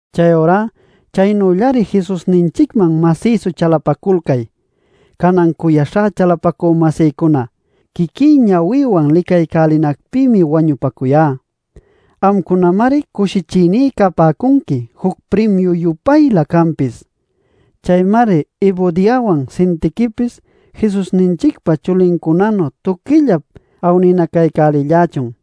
Chayurá chaynüllari Jesusninchicman masïsu chalapaculcay. Canan cuyaśhá chalapacü-masïcuna, quiquí ñawïwan licaycälinacpïmi wañupacuyá. Amcunamari cushichïní capäcunqui juc primiu-yupaylä canpis. Chaymari Evodiawan Sintiquipis Jesusninchicpa chulincunanu tuquillap awninacaycälillächun.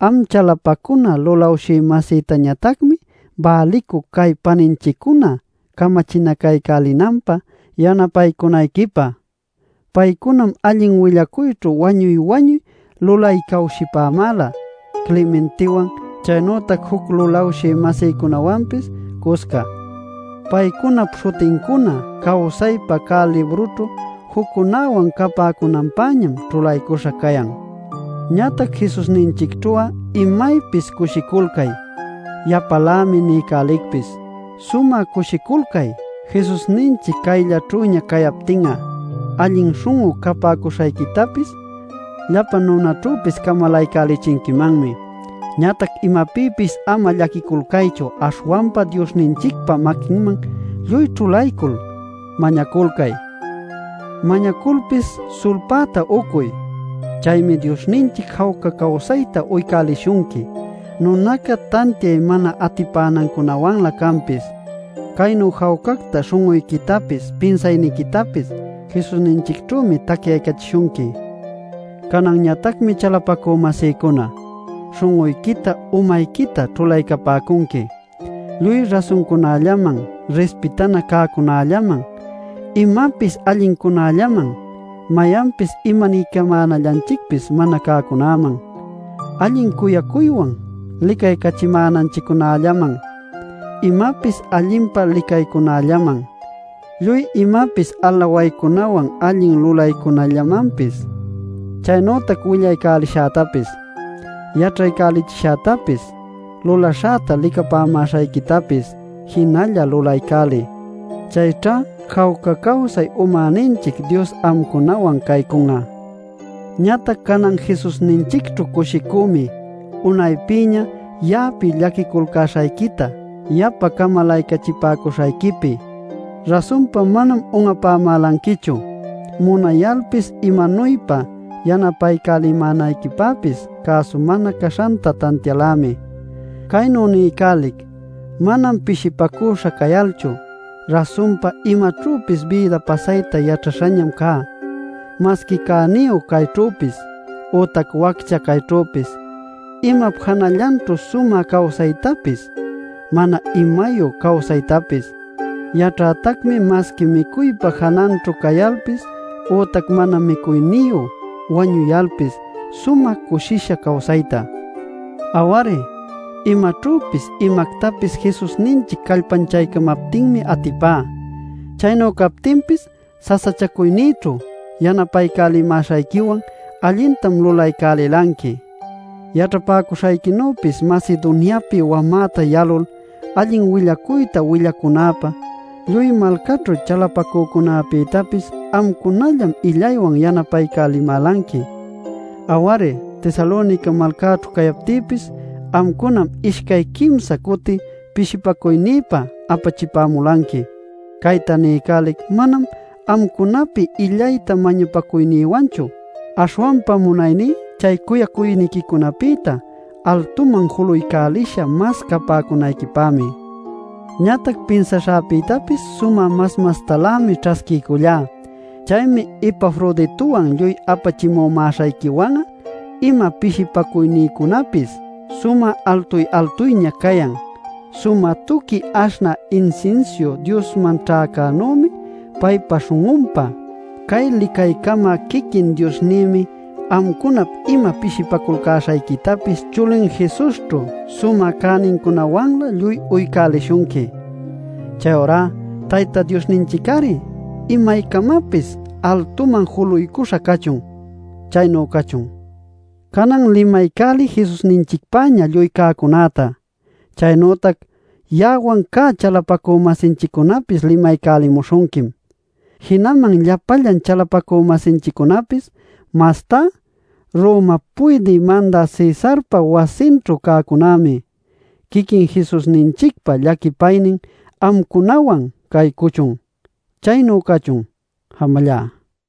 Am chalapacuna lulawshï-masïtañatacmi bälicuc cay paninchiccuna camachinacaycälinanpä yanapaycunayquipä. Paycunam allin willacuyćhu wañuy-wañuy lulaycawshipämäla Clementewan chaynütac juc lulawshï-masïcunäwanpis cusca. Paycunap śhutincuna cawsaypa cä librućhu juccunäwan capäcunanpäñam ćhulaycuśha cayan. Ñatac Jesusninchicćhu'a imaypis cushiculcay. Yapalämi niycälicpis: ¡Sumä cushiculcay! Jesusninchic cayllaćhüña cayaptin'a allin śhun'u capäcuśhayquitapis llapa nunaćhüpis camalaycälichinquimanmi. Ñatac imapïpis ama llaquicuyalcaychu. Aśhwanpa Diosninchicpa maquinman lluy ćhulaycul mañaculcay; mañaculpis sulpäta ucuy. Chaymi Diosninchic jawca cawsayta uycälishunqui nunaca tantiay mana atipänancunawanlä canpis. Caynu jawcacta śhun'uyquitapis, pinsayniquitapis Jesusninchicćhümi tacyaycachishunqui. Cananñatacmi, chalapacü-masïcuna, śhun'uyquita umayquita ćhulaycapäcunqui: lluy rasuncunällaman, rispitana cäcunällaman, imapis allincunällaman, mayanpis imaniycamänallanchicpis mana cäcunäman, allin cuyaywan licaycachimänanchiccunällaman, imapis allinpa licaycunällaman, lluy imapis alawaycunawan allin lulaycunällamanpis. Chaynütac willaycälishätapis, yaćhaycälichishätapis, lulaśhäta licapämäśhayquitapis jinalla lulaycäliy. Chayćha jawca cawsay umäninchic Dios amcunawan caycun'a. Ñatac canan Jesusninchicćhu cushicümi unaypïña ya'api llaquiculcäśhayquita yapa camalaycachipäcuśhayquipi. Rasunpa manam un'apamälanquichu; munayalpis imanuypa yanapaycälimänayquipäpis cäsu mana caśhanta tantialämi. Caynu niycälic manam pishipacüśha cayalchu. Rasunpa imaćhüpis bïda pasayta yaćhaśhañam cá, masqui cäniyu cayćhüpis, ütac waccha cayćhüpis, imap janallanćhu sumä cawsaytapis, mana imayu cawsaytapis. Yaćhätacmi masqui micuypa jananćhu cayalpis ütac mana micuyniyu wañuyalpis sumä cushisha cawsayta. Aw-ari, imaćhüpis, imactapis Jesusninchic callpanchaycamaptinmi atipá. Chaynu captinpis sasachacuynïćhu yanapaycälimäśhayquiwan allintam lulaycälilanqui. Yaćhapäcuśhayquinüpis Macedoniapi wamäta yalul allin willacuyta willacunäpä, lluy malcaćhu chalapacücunapïtapis amcunallam illaywan yanapaycapämälanqui. Aw-ari Tesalonica malcaćhu cayaptïpis amcunam ishcay quimsa cuti pishipacuynïpä apachipämulanqui. Cayta niycälic manam amcunapi illayta mañapacuynïwanchu. Aśhwanpa munayní chay cuyacuyniquicunapïta altuman julaycälisha mas capäcunayquipämi. Ñatac pinsaśhäpïtapis sumä mas mastalämi ćhasquiycullá. Chaymi Epafroditowan lluy apachimumäśhayquiwan'a ima pishimäśhancunäpis sumä altuy-altuyña cayan. Sumä tuqui aśhnä insinsiu Diosman ćhäcänümi paypa śhun'unpä. Cay licaycamä quiquin Diosnïmi amcunap ima pishipaculcäśhayquitapis chulin Jesusćhu sumä cänincunawanlä lluy uycälishunqui. Chayurá Tayta Diosninchic-ari imaycamapis altuman juluycuśha cachun. Chaynu cachun. Canan limaycäliy Jesusninchicpäña lluy cäcunäta. Chaynütac ya'awan cä chalapacü-masinchiccunapis limaycälimuśhunquim, jinaman llapallan chalapacü-masinchiccunapis, mastá Romap puydï mandä Cesarpa wasinćhu cäcunämi. Quiquin Jesusninchicpa llaquipaynin amcunawan caycuchun. Chaynu cachun. Jamallá.